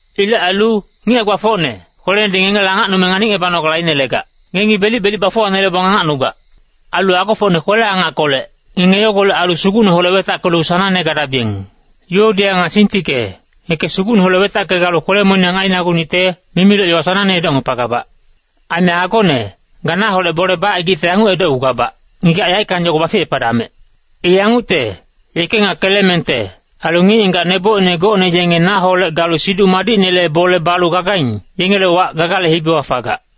Ilec ailu, ngic hae-gbafocne, kwelenedi ngengele angacnume nganicngebanogale ainelegac. Ngengi belic-belic bafuwanelebong angacnugac. Ailu agofocne kwele-angackolec, ngenge yogolec ailu Sugucneholec wetackelu sanangne gadabiyeng. Yuodia nga Sintike, ngeke Sugucneholec wetacke galu kwele-moniyang ainagunicte, mimiloc yowa sanangne edocngepagabac. Aime agone, ga naholec bole bacaigicte yanguc edocgugabac, ngigac yaeckang yogo baficepadamec. I yangucte, yeke nga Kelemente, ailu ngic-ngigac nebocine gocne yenge naholec galu Siduc Madicnele bole balu gagaing, yengele wac Gagale hibiwa fagac.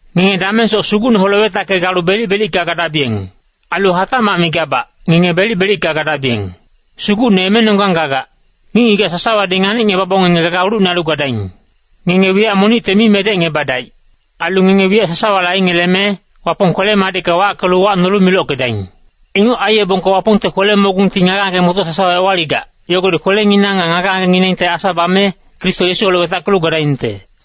Ngenge damengsoc Sugucneholec wetacke galu belic-belicka gadabiyeng. Ailu hatacmac migabac, ngenge belic-belicka gadabiyeng. Sugucne emenonggang gagac. Ngic-ngigac sasawadi nganicngebabong ngenge gaga ulucne ailu gadaing. Ngenge wiyac monicte mi medecngebadaic. Ailu ngenge wiyac sasawale aingeleme, Wapong kwele-madicka wackelu uwacnolu milockedaing. Inguc aiyebongka Wapongte kwele-mogungti ngage-ngage-motoc sasawa ewaligac, yogodi kwelengineng nga ngage-ngagenginengte asa bame, Kristo Yesuholec wetackelu gadaingte.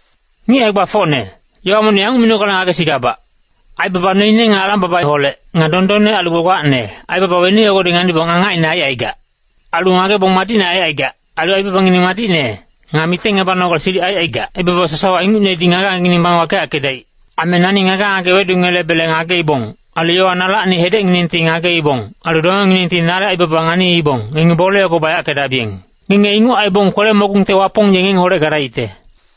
Ngic hae-gbafocne, yowa monic yanguc minogale ngagesigabac. Aibaba noine nga alang-babaholec, nga dondonne ailu gbagbacne, aibaba weni yogodi nganibong angacine aicaigac. Ailu ngagebong madicne aicaigac, ailu aibabangineng madicne, nga mitengngebanogale silic aicaigac, aibaba sasawa ingucnedi ngage-ngagengineng bame wakeyackedaic. Aime nani ngage-ngage wedungelebe ngageibong, ailu yowa nalacni hedecnginengti ngageibong, ailu dongenginengti nale aibaba nganiibong, ngenge bole yogo bayackedabiyeng. Ngenge inguc aibong kwele-mogungte Wapong ye ngengeholec gadaicte.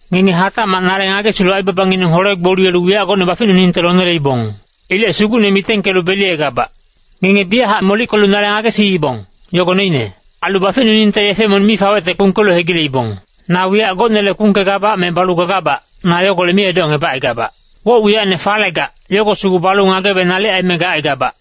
Ngenge hatacmac nale ngagesilu aibabangineng hole-gboliyelu wiyac gocne baficnuningte loneleibong. Ilec Sugucne mitengkelu beliyegabac. Ngenge biyachac molickelu nale ngagesiibong, yogo noine. Ailu baficnuningte yefe monic mi fawecte kpungkelu hegileibong. Na wiyac gocnele kpungkegabac me balu gagabac, na yogolec mi edocngebacaigabac. Woc-wiyacne fanelegac, yogo sugu balu ngagebe nalic aime gacaigabac.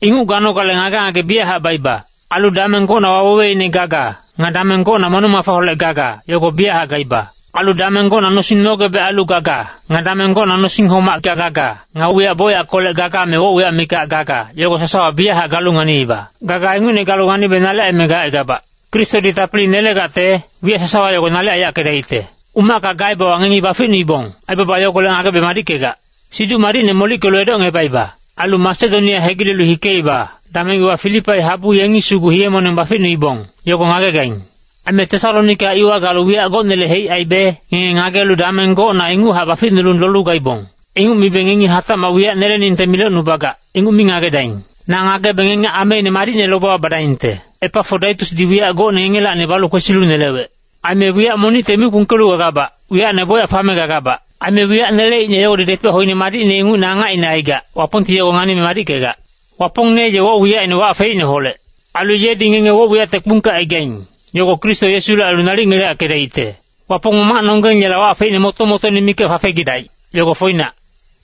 Inguc ganogale ngage-ngage biyachac baiba. Ailu dameng gocna waweweine gaga, nga dameng gocna moneng-mafaholec gaga, yogo biyachac gaiba. Ailu dameng gocna nosing nogebec ailu gaga, nga dameng gocna nosing homacka gaga, nga wiyac bocyackolec gaga me woc-wiyac mikac gaga, yogo sasawa biyachac galu nganiiba. Gaga ingucne galu ngagebe nalic aime gacaigabac. Kristodi tapili nelegacte, wiyac sasawa yogo nalic aiyackedacte. Umacka gaebewa ngengi baficnuibong, aibaba yogolec ngagebe madickegac. Siduc Madicne molickelu edocngebaiba. Ailu Masedonia hegilelu hikeiba, dameng iwa Filipai habu ngengi sugu hiye-moneng baficnuibong, yogo ngagegaing. Aime Tesalonika iwa galu wiyac gocnele heic aibe, ngenge ngagelu dameng gocna inguchac baficnulu lolu gaibong. Inguc mibe ngengi hatacmac wiyac neleningte milocnubagac, inguc mi ngagedaing. Na ngagebe ngenge ameine madicne lobewa badaingte. Epafodaitusdi wiyac gocne ngengelacni balu kwesilu nelewec. Aime wiyac monicte mi kpungkelu gagabac, wiyacne bocyac fame gagabac. Aime wiyac neleicne yogodi depec hoine madicne ingucne angacine aigac, Wapongti yogo nganime madickegac. Wapongne ye woc-wiyacine wac feicneholec. Ailu yedi ngenge woc-wiyacte kpungkecaigaing, yogo Kristo Yesule ailu nalic ngeleyackedaicte. Wapong Mamacnonggeng Yela wac feicne moto-motoine mikac fafegidaic, yogo foinac.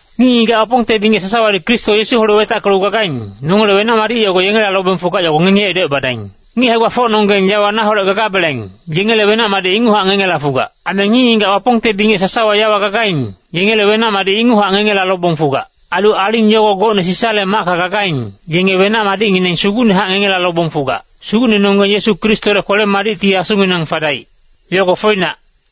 Ngic-ngigac Wapongte bingec sasawadi Kristo Yesuholec wetackelu gagaing, nongele wenac-madic yogo yengela fugac yogo ngengi edocebadaing. Ngic hae-gbafocnonggeng yawa naholec gagabeleng, yengele wenac-madic inguchac ngengela fugac. Aime ngic-ngigac Wapongte bingec sasawa yawa gagaing, yengele wenac-madic inguchac ngengela lobong fugac. Ailu aling yogo gocne Sisale macka gagaing, yenge wenac-madicngineng sugucnehac ngengela lobong fugac. Sugucnenonggeng Yesu Kristole kwele-madicti asunginang fadaic. Yogo foinac.